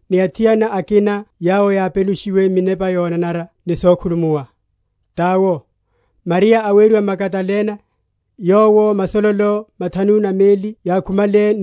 ni athiana akina yawo yápenushiwe minepa yonanara ni sokhulumuwa, tawo, Mariya aweriwa Magadalene, yowo masololo mathanu na meli yámukhumenle,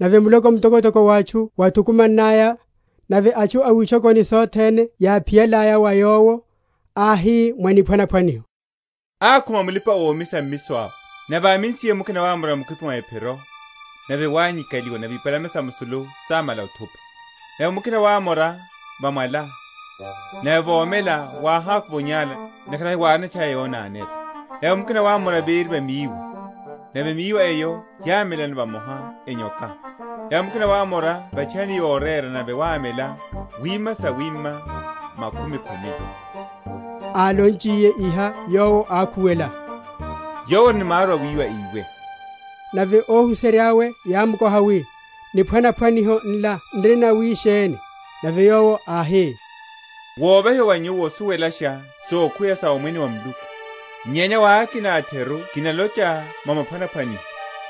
Nave muloko mtokotoko wa atchu wáthukumannaya, nave atchu a witchokoni sothene yáphiyalaya wa Yowo, áhi mwa niphwanaphwaniho: Akhuma mulipa‐omisa omisa mmiso awe; nave ámisiye mukina wámora mukhwipi mwa ephiro; nave wányikaliwa, nave ipalame sa musulu sámala othupa. Nave mukina wámora va mwala; nave vomela wáhákuva onyála, ntakhara hiwárino etchaya yonanela. Nave mukina wámora véri va míwa; nave míwa eyo yámelano vamoha, enyoka. Nave mukina wámora va’tchayani yorera, nave wámela, wima sawíma sa makhumi khumi. Álonchiye iha Yowo ákhuwela, Yowo ori ni maru awíwa íwe. Nave óhuserya’we yámkoha, wi, Niphwanaphwaniho nla n’ri nawisheni? Nave Yowo áhi, Wovahiwa wa Nyuwo osuwelasha sokhuweya sa Omwene wa Muluku; nyenya wa akina a’theru kinalocha mwa maphwanaphwaniho;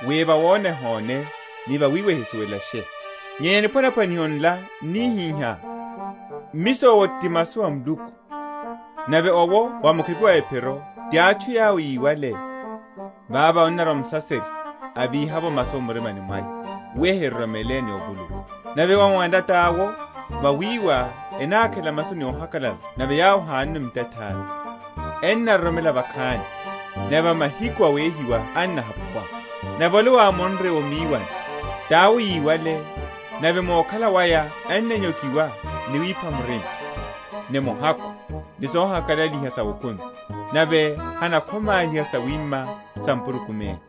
wi vawona ehone, ni vawiwa ehisuwelashe. Nyenya niphwanaphwaniho nla n’nihiha: Mmiso owo ti masu a Muluku. Nave owo wa mukhwipi mwa ephiro ti atchu yawo yiwale; vavo annarwa Musaserya, avíha masu m’mirimani mwaya, wi enirimroromela ni ovuluwa. Nave wa va mwala tawo, vawiwa, enákhela masu ni ohakalala nave yawo hiyanono mutathári, enaroromela vakhani, nave va mahiku awehiwa ennahapuwa. Nave ole wámonre o miwani, tawo yiwale, nave mu okhala waya ennanyokiwa ni wipa murima, ni muhakhu, ni sohakalaliha sa okumi, nave henakhomáliha sawima sa mpurukumene.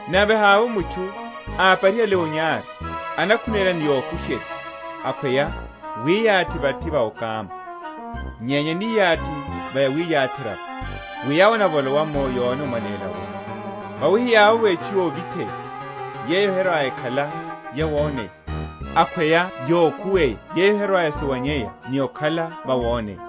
Nave havovo mutchu, aparihale onyari, anakhunéla ni yokusherya, akhweya wiyathi vathi va okama; nyenya aniyathi va yawiyatherya’vo, wi yawo enavolowa’mo yone omwaléla wu. Vawi hiyavovo etchu yovitheya, yeyo herwa‐ekhala yawoneya; akhweya yokhuweya yeyo herwa‐esuwanyeya ni okhala vawoneya.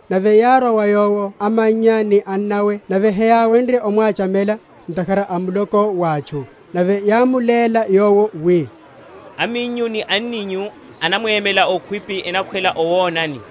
Nave yárwa wa Yowo amannya ni annawe, nave heyáwenrye omwachamela, ntakhara a muloko wa atchu. Nave yámuléla Yowo, wi, Aminyu ni anninyu enamwemela okhwipi, enakhwela owonani.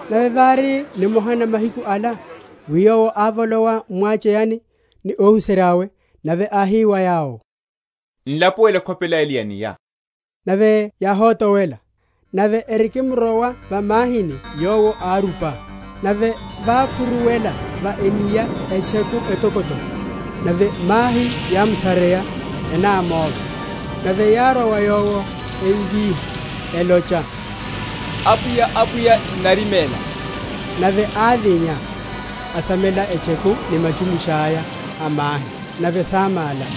Nave vári nimoha na mahiku ala, wi Yowo ávolowa m’mwacheyani, ni óhuserya’we; nave áhi wa yawo, N’lapuwele ekhopela ele ya enia; nave yáhotowela. Nave erikimrowa va mahini Yowo árupa. Nave vákhuruwela va enia etcheku etokotoko; nave mahi yámsareya, enámóva. Nave yárwa wa Yowo, emvíha, elocha, Apwiya, Apwiya, n’nariméla. Nave ávinya, asamela etcheku ni machumusha’ya a mahi; nave sámála.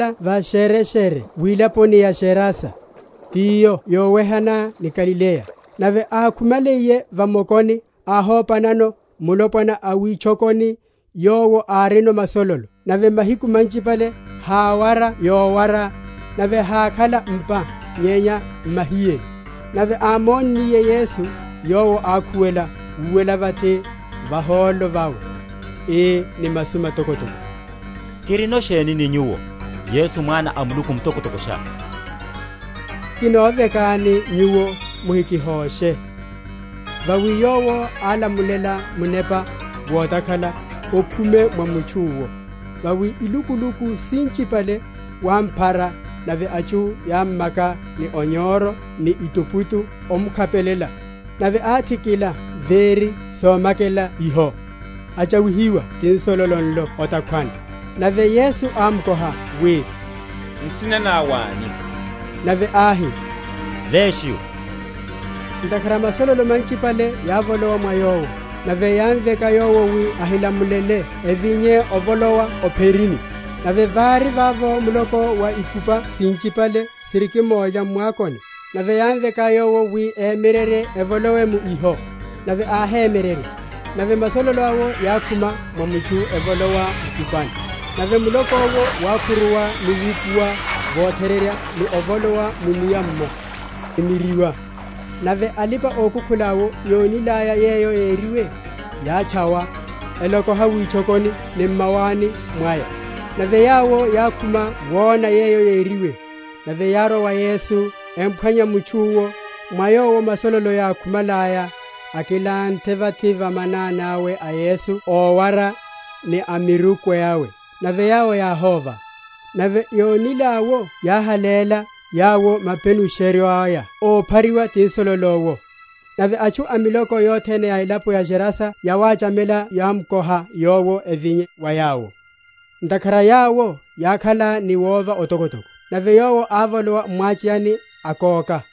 Nave yawo yápurulela va’shereshere wilaponi ya Gerasa, tiyo yowehana ni Galileya. Nave ákhumenliye va mokoni, áhopanano mulopwana a witchokoni, yowo árino masololo; nave mahiku manchipale háwara yowara, nave hákhala m’pa, nyenya m’mahiyeni. Nave ámonniye Yesu yowo ákhuwela, úwela vathi vahólo vawe, ii ni masu matokotoko, Kirino sheni ni Nyuwo, Yesu Mwana a Muluku Mtokotokosha? Kinovekani Nyuwo muhikihoshe? Vawi Yowo álamulela munepa wotakhala okhume mwa mutchu’wo. Vawi ilukuluku sinchipale wámphara; nave atchu yámmaka ni onyoro ni etuputu omkhapelela; nave áthikila véri somakela iho, atchawihiwa ti nsololo nlo o’takhwani. Nave Yesu ámkoha, wi, Nsina ná wáni? Nave áhi, Legio, ntakhara masololo manchipale yávolowa mwa yowo. Nave yámveka Yowo, wi ahilamulele evinye ovolowa o’pherini. Nave vári vavo muloko wa ikupa sinchipale sirikimulya m’mwakoni. Nave yámveka Yowo wi, emyererye, evolowe mu iho. Nave áhemyererya. Nave masololo awo yákhuma mwa mutchu evolowa mu ikupani: nave muloko’wo wákhuruwa ni wupuwa votherereya ni ovolowa mu’nia’mmo, simiryiwa. Nave alipa‐okukhula’wo yonilaya yeyo yériwe, yátchawa, elokoha witchokoni ni m’mawani mwaya. Nave yawo yákhuma wona yeyo yériwe; nave yárwa wa Yesu, emphwanya mutchu’wo, mwa yowo masololo yákhumalaya, akilanthe vathi va manani awe a Yesu ówara ni amiruku awe; nave yawo yáhóva. Nave yónil’awo yáháléla yawo mapenusheryo aya a óphariwa ti nsololo’wo. Nave atchu a miloko yothene a elapo ya Agerasa yawachamela yámkoha Yowo avinye wa yawo; ntakhara yawo yákhala ni wova otokotoko. Nave Yowo ávolowa m’mwacheyani, akóka.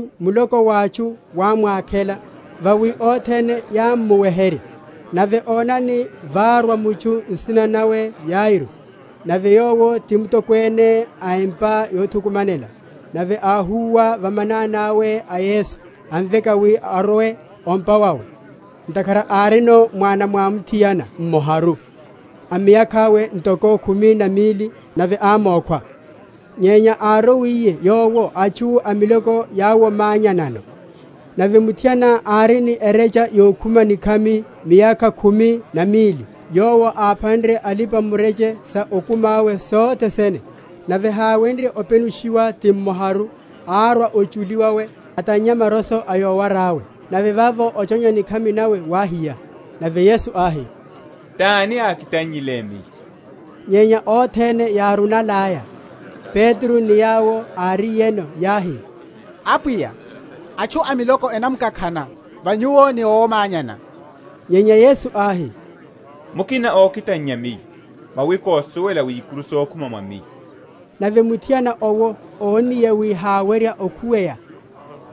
Nave vókóka Yesu, muloko wa atchu wámwakhela; vawi othene yámmuweherya. Nave onani, várwa mutchu nsina nawe Yairo, nave yowo ti mutokwene a empa yothukumanela; nave áhúwa va manani awe a Yesu, amveka wi arwe o’mpa wawe; ntakhara árino mwana mwamuthiana mmoharu, a miyakha’we ntoko khumi na mili, nave ámókhwa. Nyenya árowiye Yowo atchu a miloko yáwomanyanano. Nave muthiana, ári ni erecha yokhuma nikhami miyakha khumi na mili, yowo áphánrye alipa‐mureche sa okumi awe sothe sene, nave háwenrye openushiwa ti mmoharu, árwa ochuli wawe, atannya maroso a yowara’we: nave vavo ochonya nikhami wawe wáhiya. Nave Yesu áhi, Tani akitannyile Miyo? Nyenya othene yárunalaya, Petro ni yawo áriyeno yáhi, Apwiya, atchu a miloko enamkakhana va Nyuwo ni owomanyana. Nyenya Yesu áhi, Mukina okitannya Miyo; vawi kosuwela wi ikuru sokhuma mwa Miyo. Nave muthiana owo ónniye wi hawerya okhuweya,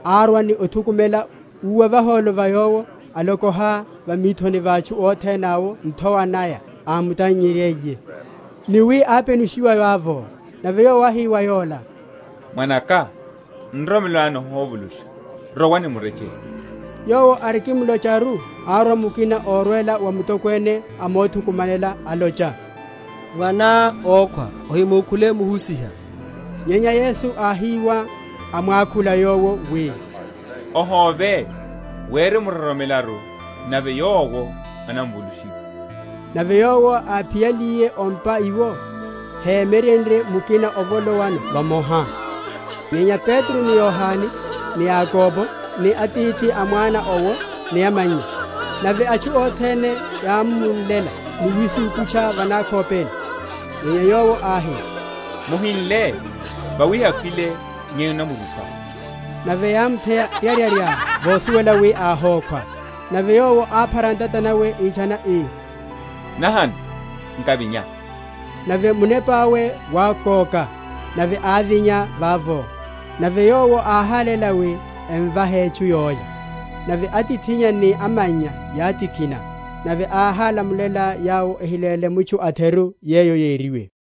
árwa ni othukumela, úwa vahólo va Yowo, alokoha va mithoni va atchu othene awo nthowa naya ámutannye?-?nryiye, ni wi ápenushiwa vavo. Nave Yowo áhi wa yola, Mwanaka, nroromelo ná nihovulusha; rowa ni murechele. Yowo arikimlocharu, árwa mukina órwela wa mutokwene a mothukumanela, alocha, Mwaná ókhwa; ohimukhule Muhusiha. Nyenya Yesu áhiwa, amwakhula yowo, wi, Ohóve; wirimroromelaru, nave yowo anavulushiwa. Nave Yowo áphiyaliye o’mpa iwo, hemyerenrye mukina ovolowano vamoha, nyenya Petro, ni Yohane, ni Yakobo, ni atithi a mwana owo, ni amannya. Nave atchu othene yámmunlela ni wisukutcha va nakhopeni. Nyenya Yowo áhi, Muhinle; vawi hakhwile, nyenya anamrupa. Nave yámutheya ryaryarya vosuwela wi áhókhwa. Nave Yowo áphara ntata nawe, itchana, ii, Nahano, nkavinya. Nave munepa’we wákóka, nave ávinya vavo; nave Yowo áháléla wi emvahe etchu yólya. Nave atithinnya ni amannya yátikhina: nave áhálamulela yawo ehiléle mutchu a’theru yeyo yériwe.